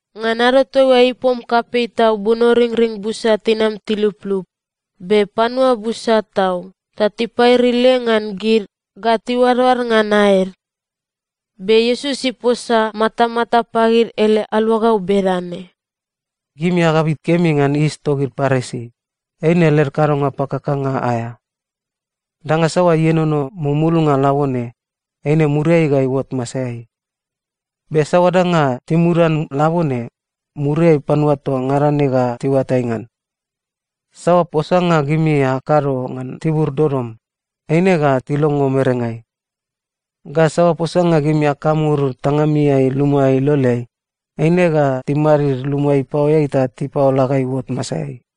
Ngan ado toaiua, ipom kapei tau bunoringring busa tinam tiluplup, be panua busa tau ta tipairile ngan gid ga tiuadoad ngan aed. Be Iesus iposa matamata pagid ele aluagau bedane, “Gimi agabit kemi ngan yis togid Parisi, eine led kadonga pakakanga aea. Danga saoa ienono mumulnga labone, eine muriai ga iuot masaeai. Be saoa danga timudan labone, muriai panua toa ngada ne ga tiuatai ngan. Saoa posanga gimi akado ngan tibur dodom, eine ga tilongo merengai. Ga saoa posanga gimi akamur tangamiai luma iloleai, eine ga timadid luma ipaoeai ta tipaola ga iuot masaeai.”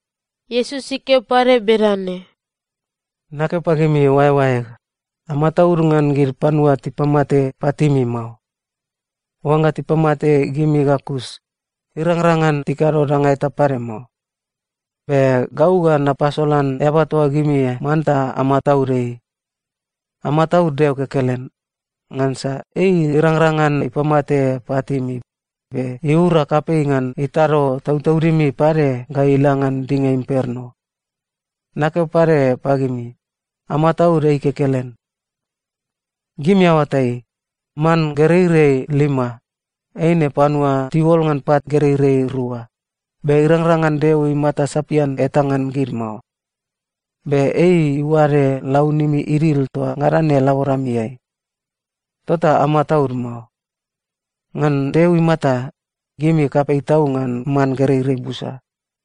Iesus ikeo pade bedane, “Nakeo pagimi oaeoaeg, amataud ngan gid panua tipamate patimi mao. Oangga tipamate gimi ga kus, irangrang ngan tikado danga eta pade mao. Be gau ga napasolan eaba toa gimi manta amataud ei. Amataud Deo kekelen, ngansa ei irangrang ngan ipamate patimi, be iura kapei ngan itado tautaudimi pade ga ila ngan dinga imperno. Nakeo pade pagimi, amataud ei kekelen. Gimi aoatai, man gereirei lima, eine panua tiuol ngan pat gereirei rua, be irangrang ngan Deo imata sapian eta ngan gid mao. Be ei iuade launimi idil toa ngada ne laboramiai. Tota amataud mao. Ngan Deo imata, gimi kapei tau ngan man gereirei busa.”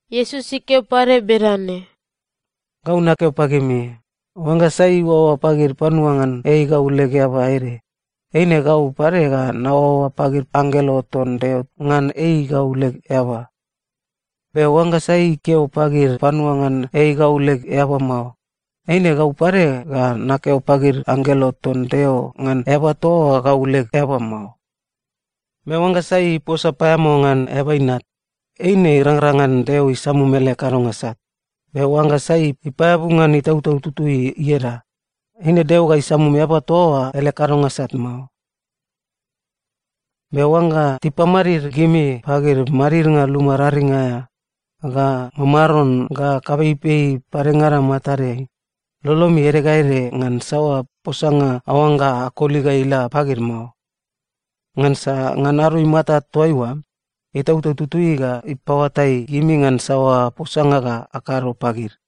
Iesus ikeo pade bedane, “Gau nakeo pagimi, oangga sai iuaoa pagid panua ngan ei gau leg eaba ede, eine gau pade ga naoaoa pagid anggelo ton Deo ngan ei gau leg eaba. Be oangga sai ikeo pagid panua ngan ei gau leg eaba mao, eine gau pade ga nakeo pagid anggelo ton Deo ngan eaba toa oa gau leg eaba mao. Be oangga sai iposa paeamao ngan Eaba Inat, eine irangrang ngan Deo isamum ele kadonga sat. Be oangga sai ipaeabu ngan Itautau Tutui ieda, eine Deo ga isamum eaba toa oa ele kadonga sat mao. “Be oangga tipamadid gimi pagid madidnga luma raring aea, ga mamaron ga kapeipei padengada matadeai, lolomi ede ga ede ngan saoa posanga aoangga akoli ga ila pagid mao. Ngansa ngan ado imata toaiua, Itautau Tutui ga ipaoatai gimi ngan saoa posanga ga akado pagid.”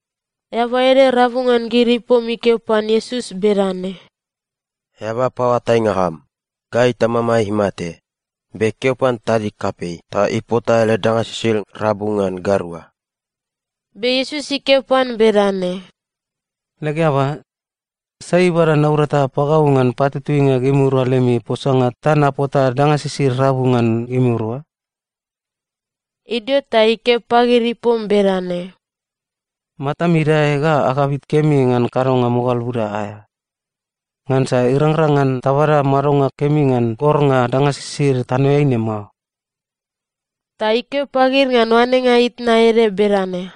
Eaba ede rabu ngan gid ipom ikeo pan Iesus bedane, “Eaba paoatainga am, gai tamamai imate, be keo pan tadig kapei ta ipota ele danga sisid rabu ngan gairua.” Be Iesus ikeo pan bedane, “Leg eaba, sai ibada naurata pagau ngan patutuinga gimirua lemi posanga ta napota danga sisid rabu ngan gimirua?” Idio ta ikeo pagid ipom bedane, “Matami idae ga agabit kemi ngan kadonga mogal buda aea. Ngansa irangrang ngan tabada madonga kemi ngan gornga danga sisid tanoeai ne mao.” Ta ikeo pagid ngan oanenga itna ede bedane,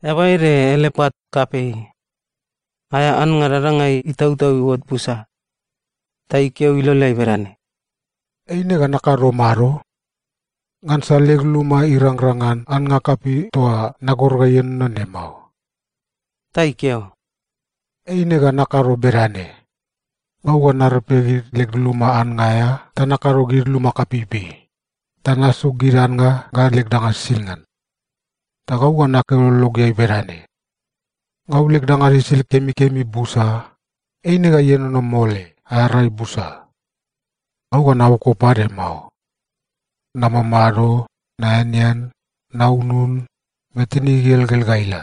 “Eaba ede ele pat kapei. Aea annga dadangai itautau iuot busa. Ta ikeo iloleai bedane, ‘Eine ga nakado mado? Ngansa leg luma irangrang ngan annga kapei toa nagor ga ienono ne mao.’ “Ta ikeo, ‘Eine ga nakado bedane: Gau ga narepe gid leg luma annga aea ta nakado gid luma kapeipei, ta nasuk gid annga ga leg danga sisid ngan. Ta gau ga nakeo lologeai bedane, “Gau leg danga sisid kemikemi busa. Eine ga ienono mole aea rai busa. Gau ga naboko pade mao. Namamado, naeanean, naunun, be tinig igelgel ga ila.” ’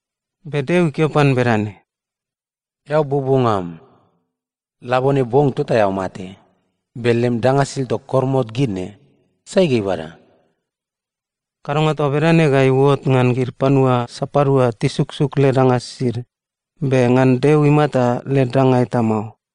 “Be Deo ikeo pan bedane, ‘Eao buobuonga am! Labone bong tota eao mate, be lem danga sisid toa koromot gid ne, sai ga ibada?’ “Kadonga toa bedane ga iuot ngan gid panua sapadua tisuksuk led danga sisid, be ngan Deo imata led danga eta mao.”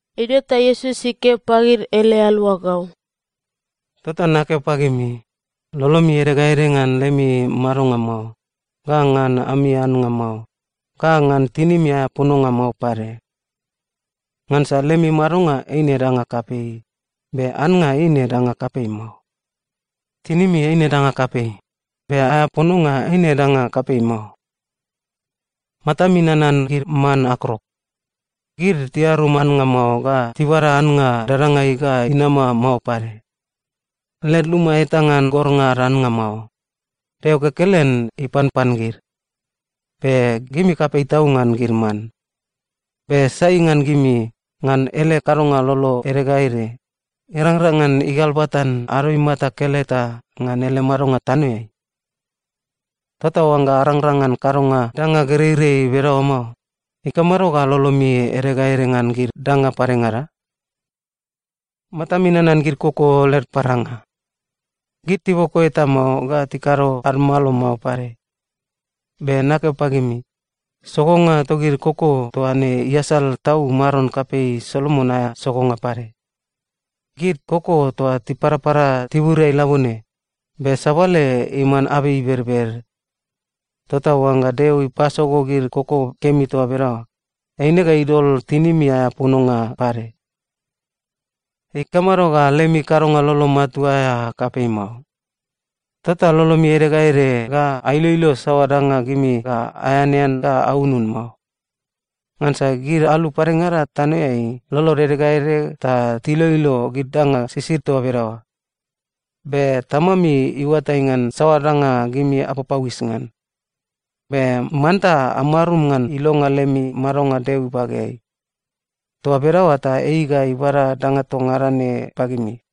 Idio ta Iesus ikeo pagid ele aluagau, “Tota nakeo pagimi, lolomi ede ga ede ngan lemi madonga mao, ga ngan ami annga mao, ga ngan tinimi aea pononga mao pade. Ngansa lemi madonga eine danga kapei, be annga eine danga kapei mao. Tinimi eine danga kapei, be aea pononga eine danga kapei mao. Matami nanan gid man akrok. Gid tiarum annga mao ga tibada annga dadangai ga inama mao pade. Led luma eta ngan gornga ad annga mao. Deo kekelen ipanpan gid. Be gimi kapei tau ngan gid man. Be sai ngan gimi, ngan ele kadonga lolo ede ga ede, irangrang ngan igalbatan ado imata keleta ngan ele madonga tanoeai? Tota oangga arangrang ngan kadonga danga gereirei bedaoa mao, ikamado ga lolomi ede ga ede ngan gid danga padengada? “Matami nanan gid koko led paranga. Gid tiboko eta mao ga tikado ad malo mao pade. Be nakeo pagimi, sogonga togid koko toa ne iasal tau maron kapei Solomon aea sogonga pade. Gid koko toa tiparapara tiburiai labone, be sabale iman abei ibedbed. Tota oangga Deo ipasogo gid koko kemi toa bedaoa, eine ga idol tinimi aea pononga pade. Ikamado ga lemi kadonga lolo matua aea kapei mao? Tota lolomi ede ga ede ga ailoilo saoa danga gimi ga aeanean ga aunun mao. Ngansa gid alu padengada tanoeai, lolod ede ga ede ta tiloilo gid danga sisid toa bedaoa. Be Tamami iuatai ngan saoa danga gimi apapauis ngan. Be manta amarum ngan ilonga lemi madonga Deo ibageai. Toa bedaoa ta ei ga ibada danga toa ngada ne pagimi.”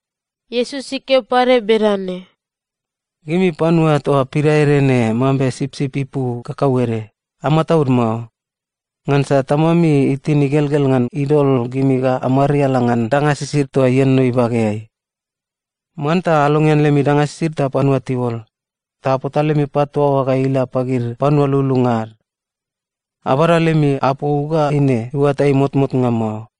Iesus ikeo pade bedane, “Gimi panua toa pidaede ne mambe sipsip ipu kakauede, amataud mao, ngansa Tamami itin igelgel ngan idol gimi ga amariala ngan danga sisid toa ienono ibageai. Manta alongean lemi danga sisid ta panua tiuol, ta apota lemi pat toa oa ga ila pagid panua lululunga ad. Abada lemi apou ga eine iuatai motmotnga mao.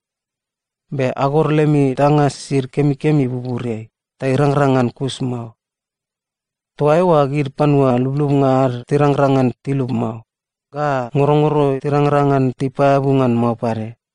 Be agor lemi danga sisid kemikemi buburiai, ta irangrang ngan kus mao. Toa eoa gid panua lublubnga ad tirangrang ngan tilub mao, ga ngorongoro tirangrang ngan tipaeabu ngan mao pade.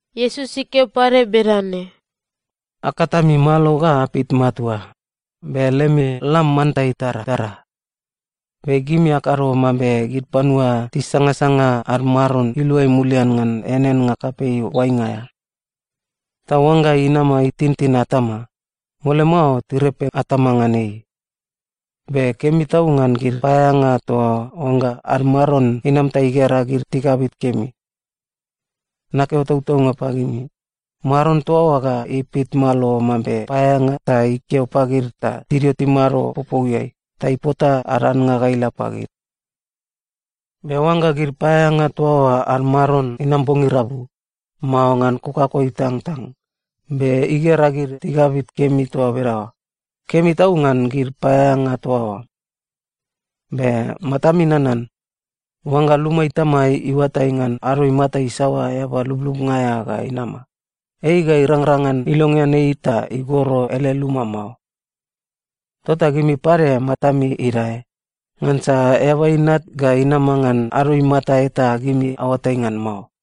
Iesus ikeo pade bedane, “Akat ami malo ga apit matua, be lemi lam manta itaratara. Be gimi akado mambe gid panua tisangasanga ad maron iluai mulian ngan eaneannga kapei oainga aea. Ta oangga inama itintin atama, mole mao tirepe atama ngan ei. Be kemi tau ngan gid paeaeanga toa oa oangga ad maron inam ta igera gid tigabit kemi. Nakeo tautaunga pagimi, maron toa oa ga ipit malo mambe paeaeanga ta ikeo pagid ta tidio timado popouiai ta ipota ad annga ga ila pagid. Be oangga gid paeaeanga toa oa ad maron inama bong irabu, mao ngan kokako itangtang, be igera gid tigabit kemi toa bedaoa, kemi tau ngan gid paeaeanga toa oa! Be matami nanan: Oangga luma itama iuatai ngan ado imata isaoa eaba lublubnga aea ga inama, ei ga irangrang ngan ilongean ei ta igoro ele luma mao. Tota gimi pade matami idae, ngansa Eaba Inat ga inama ngan ado imata eta gimi aoatai ngan mao.”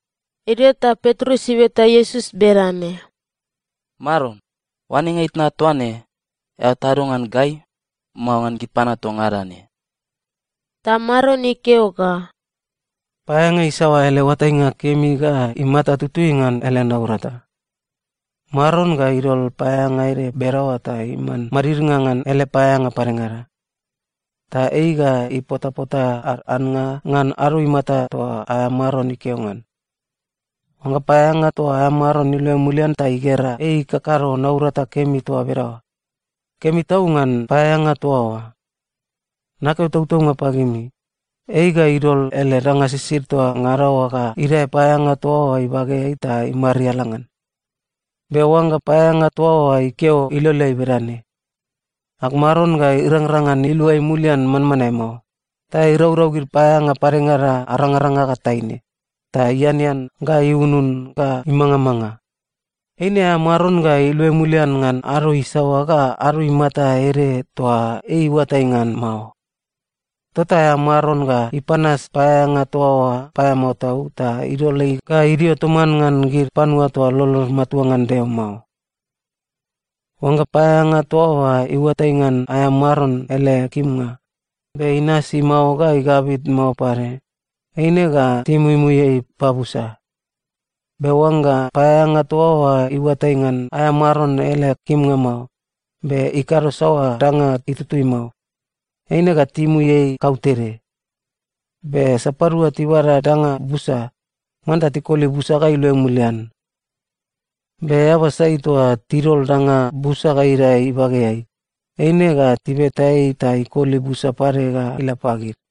Idio ta Petrus ibeta Iesus bedane, “Maron, oanenga itna toa ne, eao tado ngan gai, mao ngan gid panua toa ngada ne?” Ta Maron ikeo ga, “Paeaeanga isaoa ele oatainga kemi ga imata tutui ngan ele naurata? Maron ga idol paeaeanga ede bedaoa ta iman madidnga ngan ele paeaeanga padengada. Ta ei ga ipotapota ad annga ngan ado imata toa aea maron ikeo ngan. Oangga paeaeanga toa oa aea maron iluai mulian ta igera ei ikakado naurata kemi toa bedaoa, kemi tau ngan paeaeanga toa oa! Nakeo tautaunga pagimi, ei ga idol ele danga sisid toa ngada oa ga idae paeaeanga toa oa ibageai ta imariala ngan. Be oangga paeaeanga toa oa ikeo iloleai bedane, ‘Ag Maron ga irangrang ngan iluai mulian manmanae mao,’ ta iraurau gid paeaeanga padengada arangaranga ga taine, ta ianean ga iunun ga imangamanga, eine aea maron ga iluai mulian ngan ado isaoa ga ado imata ede toa ei iuatai ngan mao. Tota aea maron ga ipanas paeaeanga toa oa paeamao tau ta idol ei ga idio toman ngan gid panua toa lolod matua ngan Deo mao. “Oangga paeaeanga toa oa iuatai ngan aea maron ele kimnga, be inasi mao ga igabit mao pade, eine ga timuimui ei pabusa. Be oangga paeaeanga toa oa iuatai ngan aea maron ele kimnga mao, be ikado saoa danga itutui mao, eine ga timui ei kautede. Be sapadua tibada danga busa, manta tikoli busa ga iluai mulian. Be eaba sai toa tidol danga busa ga idae ibageai, eine ga tibeta ei ta ikoli busa pade ga ila pagid.”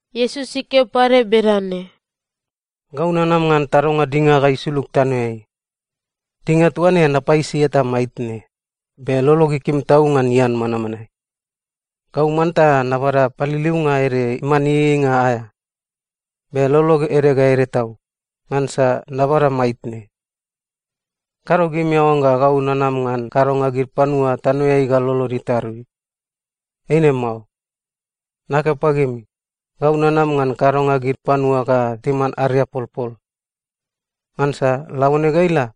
Iesus ikeo pade bedane, “Gau nanam ngan tadonga dinga ga isulug tanoeai. Dinga toa ne, napaisi eta maitne, be lolog ikim tau ngan ian manmanae! Gau manta nabada paliliunga ede iman ieieinga aea. Be lolog ede ga ede tau, ngansa nabada maitne. Kado gimi aoangga gau nanam ngan kadonga gid panua tanoeai ga lolod itarui. Eine mao. Nakeo pagimi, gau nanam ngan kadonga gid panua ga timan ariapolpol. Ngansa labone ga ila,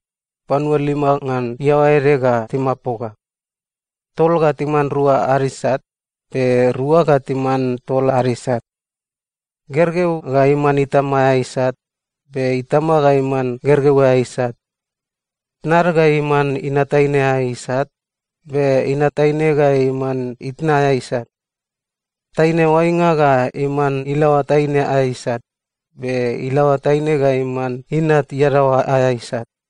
panua lima ngan iaoa ede ga timapoga. Tol ga timan rua ad isat, be rua ga timan tol ad isat. Gergeu ga iman itama aea isat, be itama ga iman gergeu aea isat. Tnad ga iman inat taine aea isat, be inat taine ga iman itna aea isat. Taine oainga ga iman ilaoa taine aea isat, be ilaoa taine ga iman inat iadaoa aea isat.”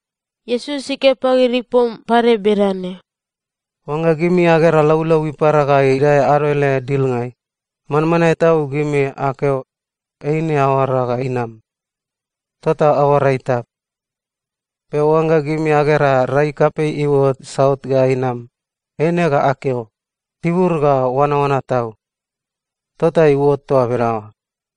Iesus ikeo pagid ipom pade bedane, “Oangga gimi agera laulau ipara ga idae ado ele dilngai, manmanae tau gimi akeo, ‘Eine aoara ga inam.’ Tota aoara itap. Be oangga gimi agera rai kapei iuot saut ga inam, eine ga akeo, ‘Tibur ga oanaoana tau.’ Tota iuot toa bedaoa.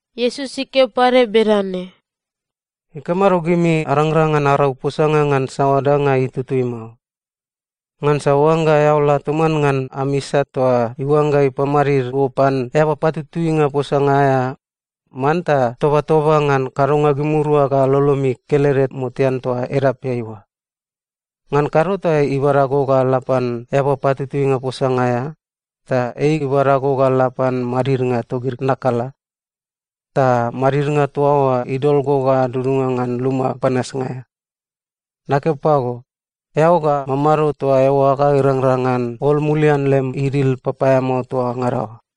Iesus ikeo pade bedane, “Ikamado gimi arangrang ngan arau posanga ngan saoa danga itutui mao? Ngansa oangga eao la toman ngan am isat toa iuangga ipamadid go pan eaba patutuinga posanga aea, manta tobatoba ngan kadonga gimirua ga lolomi kelede motean toa edapeai oa. Ngan kado ta ibada go ga la pan eaba patutuinga posanga aea, ta ei ibada go ga la pan madidnga togid nakala, ta madidnga toa oa idol go ga dudunga ngan luma panasnga aea. Nakeo pago, eao ga mamado toa eoa ga irangrang ngan ol mulian lem idil papaeamao toa ngada oa.”